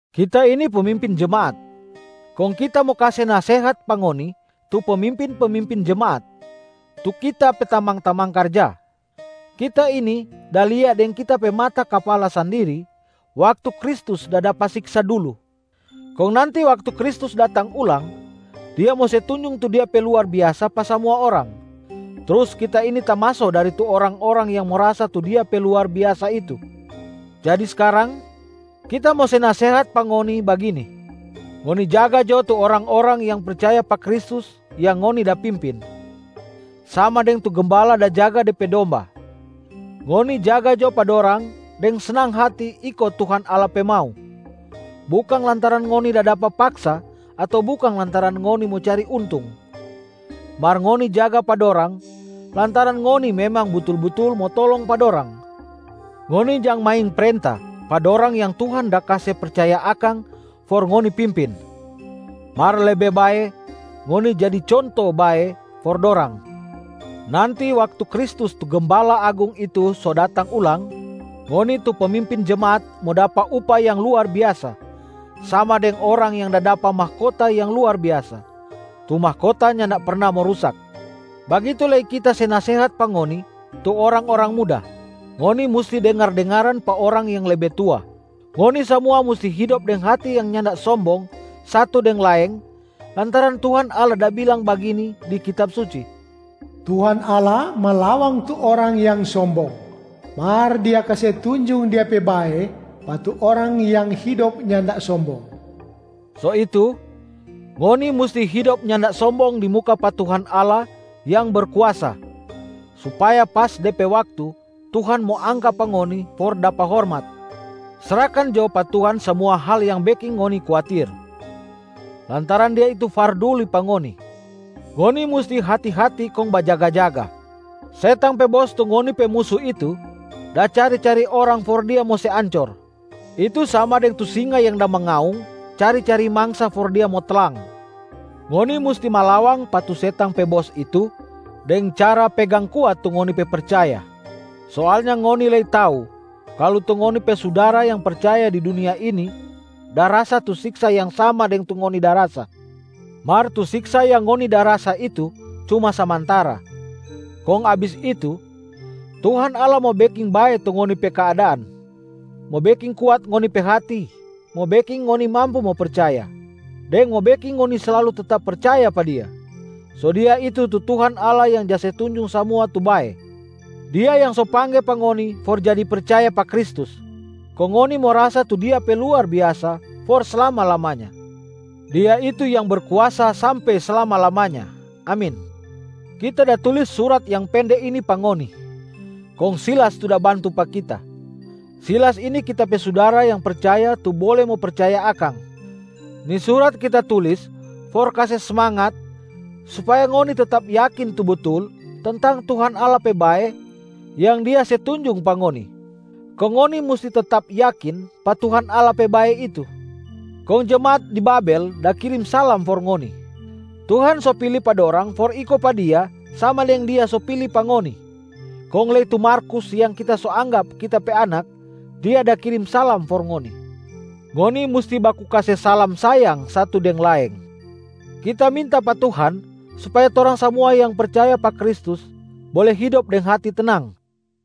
Kita ini pemimpin jemaat, kong kita mo kase nasehat pa ngoni tu pemimpin-pemimpin jemaat, tu kita pe tamang-tamang karja. Kita ini da lia deng kita pe mata kapala sandiri waktu Kristus da dapa siksa dulu. Kong nanti waktu Kristus datang ulang, Dia mo se tunjung tu Dia pe luar biasa pa samua orang, trus kita ini tamaso dari tu orang-orang yang mo rasa tu Dia pe luar biasa itu. Jadi skarang, kita mo se nasehat pa ngoni bagini: ngoni jaga jo tu orang-orang yang percaya pa Kristus yang ngoni da pimpin, sama deng tu gembala da jaga de pe domba. Ngoni jaga jo pa dorang deng snang hati iko tu Tuhan Allah pe mau, bukang lantaran ngoni da dapa paksa ato bukang lantaran ngoni mo cari untung, mar ngoni jaga pa dorang lantaran ngoni memang butul-butul mo tolong pa dorang. Ngoni jang main prenta pa dorang yang Tuhan da kase percaya akang for ngoni pimpin, mar lebe bae ngoni jadi conto yang bae for dorang. Nanti waktu Kristus tu Gembala Agung itu so datang ulang, ngoni tu pemimpin jemaat mo dapa upah yang luar biasa, sama deng orang yang da dapa mahkota yang luar biasa, tu mahkota nyanda perna mo rusak. Bagitu lei kita se nasehat pa ngoni tu orang-orang muda, ngoni musti dengar-dengaran pa orang yang lebe tua. Ngoni samua musti hidop deng hati yang nyanda sombong satu deng laeng lantaran Tuhan Allah da bilang bagini di Kitab Suci, “Tuhan Allah malawang tu orang yang sombong, mar Dia kase tunjung Dia pe bae pa tu orang yang hidop nyanda sombong.” So itu, ngoni musti hidop nyanda sombong di muka pa Tuhan Allah yang berkuasa, supaya pas de pe waktu Tuhan mo angka pa ngoni for dapa hormat. Srahkan jo pa Tuhan samua hal yang beking ngoni kuatir, lantaran Dia itu farduli pa ngoni. Ngoni musti hati-hati kong bajaga-jaga! Setang pe bos tu ngoni pe musu itu da cari-cari orang for dia mo se ancor, itu sama deng tu singa yang da mangaung cari-cari mangsa for dia mo tlang. Ngoni musti malawang pa tu setang pe bos itu deng cara pegang kuat tu ngoni pe percaya. Soalnya ngoni lei tau kalu tu ngoni pe sudara yang percaya di dunia ini da rasa tu siksa yang sama deng tu ngoni da rasa. Mar tu siksa yang ngoni da rasa itu cuma samantara, kong abis itu, Tuhan Allah mo beking bae tu ngoni pe keadaan, mo beking kuat ngoni pe hati, mo beking ngoni mampu mo percaya, deng mo beking ngoni slalu tetap percaya pa Dia. So Dia itu tu Tuhan Allah yang ja se tunjung samua tu bae. Dia yang so pangge pa ngoni for jadi percaya pa Kristus, kong ngoni mo rasa tu Dia pe luar biasa for slama-lamanya. Dia itu yang berkuasa sampe slama-lamanya. Amin. Kita da tulis surat yang pende ini pa ngoni, kong Silas tu da bantu pa kita. Silas ini kita pe sudara yang percaya tu bole mo percaya akang. Ni surat kita tulis for kase smangat supaya ngoni tetap yakin tu butul tentang Tuhan Allah pe bae yang Dia se tunjung pa ngoni, kong ngoni musti tetap yakin pa Tuhan Allah pe bae itu. Kong jemaat di Babel da kirim salam for ngoni. Tuhan so pili pa dorang for iko pa Dia sama deng Dia so pili pa ngoni. Kong lei tu Markus yang kita so anggap kita pe anak, dia da kirim salam for ngoni. Ngoni musti baku kase salam sayang satu deng laeng. Kita minta pa Tuhan supaya torang samua yang percaya pa Kristus bole hidop deng hati tenang.